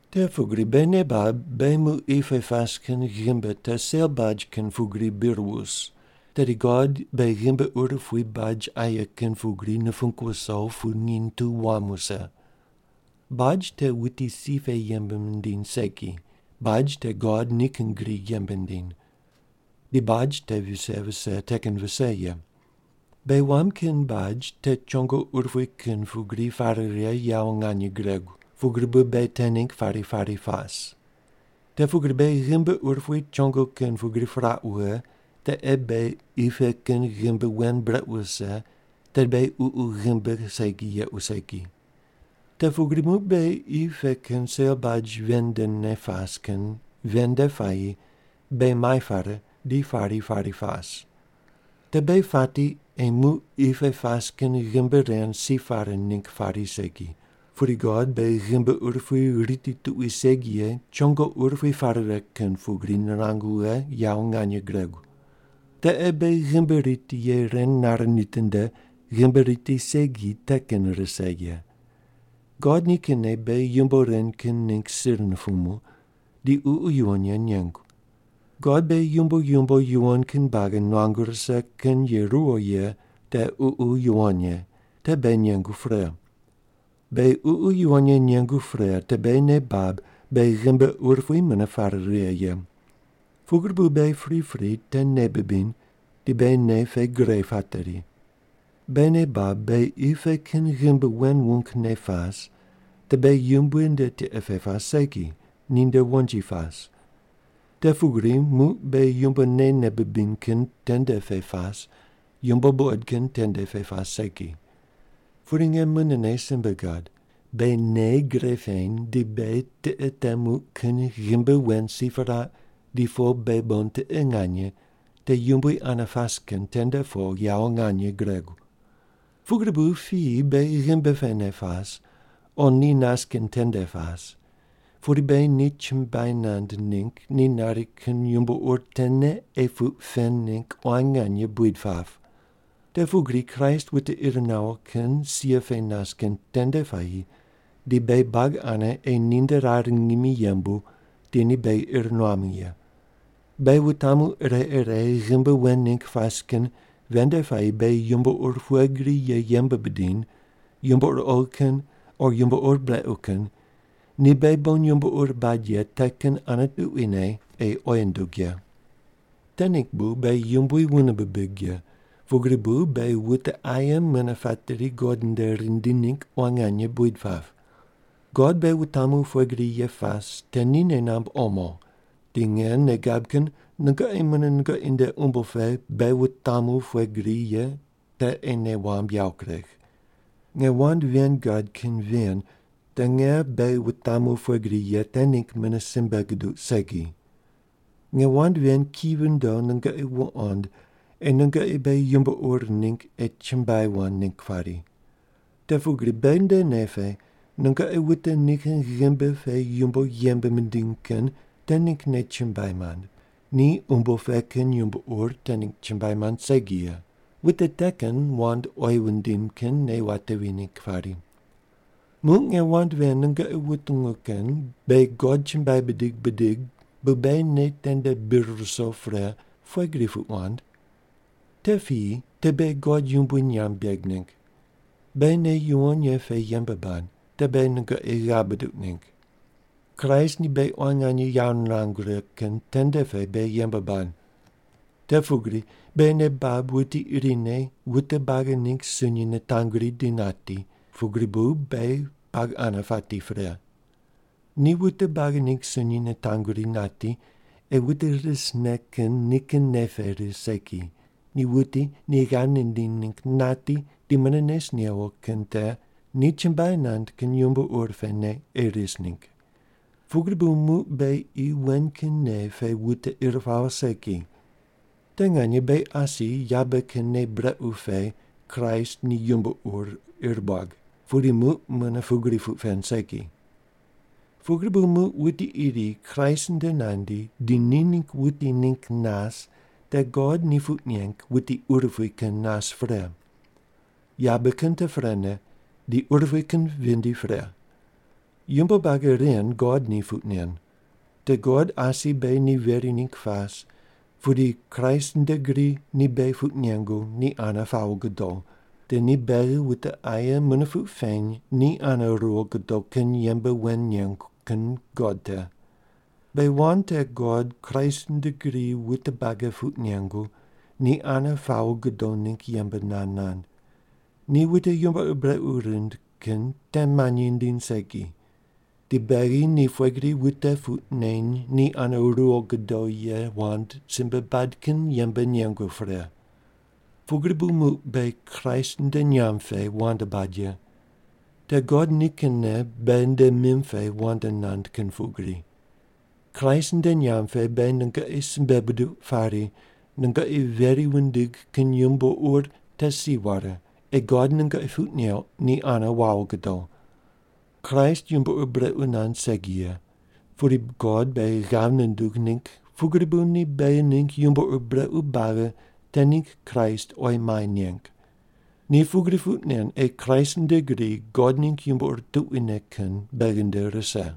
Te pugri beghi nei bab beghi muq qi pe pas kin ghimbi te sel baj kin pugri bir wus, tedi God beghi ghimbi urupui baj aye kin pugri nupung wuso pu nginy tu wam wuse. Baj te wute si pe yembe mindiny segi, baj te God nikin gri yembe nindiny. Di baj te vise vise te kin vise ye. Beghi wam kin baj te chongo urupui kin pugri pare righe yawo nganye guregu, pugri bu beghi te ningg pari pari pas. Te pugri beghi ghimbi urupui chongo kin pugri piraq wughe te ei beghi qi pe kin ghimbi wen brequ wuse tedi beghi ququ ghimbi segi yequ segi. Te pugri muq beghi qi pe kin sel baj ven ndene pas kin ven nde puayi beghi mai pare di pari pari pas. Te beghi pati ei muq qi pe pas kin ghimbi ren si pare ningg pari segi, pudi God beghi ghimbi urupui riti tuqui segi ye chongo urupui pare righe kin pugri nirangu wughe yawo nganye guregu. Te ei beghi ghimbi riti ye ren nare nitinde ghimbi riti segi te kin rise ye. God nikinne beghi yumbo ren kin ningg sir nupumu, di Ququ Yuwon Ye nengu. God beghi yumbo yumbo yuwon kin buagi nuangu rise kin ye ruwo ye te Ququ Yuwon Ye, te beghi nengu pre. Beghi Ququ Yuwon Ye nengu pre te beghi nei bab beghi ghimbi urupui mune pare righe ye. Pugri bu beghi pripri te nei bibiny di beghi nei pe gre pateri. Beghi nei bab beghi qi pe kin ghimbi wen wungne pas, te beghi Yumbui nde tiqe pe pas segi, ninde wonji pas. Te pugri muq beghi yumbo neine bibiny kin tende pe pas, yumbo buqod kin tende pe pas segi. Pudi nge munene simbe gad, beghi nei gre peny di beghi tiqe te muq kin ghimbi wen si piraq di po beghi bon tiqe nganye, te Yumbui ane pas kin tende po yawo nganye guregu. Pugri bu piyi beghi ghimbi pene pas o ni nas kin tende pas, pudi beghi ni chumbuai nand ningg ni nari kin yumbo ur tene ei puq pen ningg quan nganye buid pap. Te pugri Kraist wute ir nawo kin sia pe nas kin tende puayi di beghi buagi ane ei ninde rar ngimi yembu di ni beghi ir nuamu ye. Beghi wutamu ire ire ghimbi wen ningg pas kin ven nde puayi beghi yumbo ur pughe gri ye yembe bidiny, yumbo ur oghi kin o yumbo ur brequ kin, ni beghi bon yumbo ur bad ye te kin ane tuquine ei oyi nundug ye. Te ningg bu beghi Yumbui wune bibig ye pugri bu beghi wute aye mune pateri God nde rindi ningg quan nganye buid pap. God beghi wutamu pughe gri ye pas te ni nei namb omo, di nge nei gab kin nungoqi mune nungoqi nde umbo pe beghi wutamu pughe gri ye te ei nei wamb yawo kuregh. Nge wand ven gad kin ven te nge beghi wutamu pughe gri ye te ningg mune simbe guduq segi. Nge wand ven ki vindo nungoqi wuqond ei nungoqi beghi yumbo ur ningg ei chumbuai wand ningg pari. Te pugri beghi nde nei pe nungoqi wute nikin ghimbi pe yumbo yembe mindiny kin te ninggne chumbuai mand, ni umbo pe kin yumbo ur te ningg chumbuai mand segi ye, wute te kin wand oyi wundim kin nei watevi ningg pari. Muq nge wand ven nungoqi wutungu kin beghi God chumbuai bidig bidig bu beghi nei tende bir ruso pre, pugri bri puq wand? Te piyi te beghi God yumbui nyamb beg ningg. Beghi nei yuwon ye pe yembe bad, te beghi nungoqi ghav buduq ningg. Kraist ni beghi quan nganye yawo nirangu righe kin tende pe beghi yembe bad. Te pugri beghi nei bab wuti irine wute buagi ningg sunyi nitanguri di nati, pugri bu beghi buagi ane pati pre. Ni wute buagi ningg sunyi nitanguri nati ei wute risne kin nikin nei pe ris segi, ni wuti ni ghav nindiny ningg nati di mune nes newo kin te ni chumbuai nand kin yumbo ur pene ei ris ningg. Pugri bu muq beghi qi wen kin nei pe wute ir pawo segi. Te nganye beghi asi yabe kin nei brequ pe Kraist ni yumbo ur ir buag, pudi muq mune pugri puq pen segi. Pugri bu muq wuti iri Kraist nde nandi di ni ningg wuti ningg nas te God ni puq neng wuti urupui kin nas pre. Yabe kin te prene di urupui kin vindi pre. Yumbo buagi ren God ni puq nen. Te God asi beghi ni veri ningg pas pudi Kraist nde gri ni beghi puq nengu ni ane pawo gudo, di ni beghi wute aye mune puq peny ni ane ruwo gudo kin yembe wen nengu kin God te. Beghi wand te God Kraist nde gri wute buagi puq nengu ni ane pawo gudo ningg yembe nand nand. Ni wute yumbo ur brequ rind kin te manyi nindiny segi. Di beghi ni pughe gri wute puq neny ni ane ruwo gudo ye wand simbe bad kin yembe nengu pre. Pugri bu muq beghi Kraist nde nyamb pe wand bad ye. Te God nikinne beghi nde mim pe wand nand kin pugri. Kraist nde nyamb pe beghi nungoqi simbe buduq pari, nungoqi veri wundig kin yumbo ur te si ware ei God nungoqi puq neuq ni ane wawo gudo. Kraist yumbo ur brequ nand segi ye, pudi God beghi ghav nundug ningg pugri bu ni beghi ningg yumbo ur brequ buagi te ningg Kraist oyi mai neng. Ni pugri puq nen ei Kraist nde gri God ningg yumbo ur tuquine kin beghi nde rise.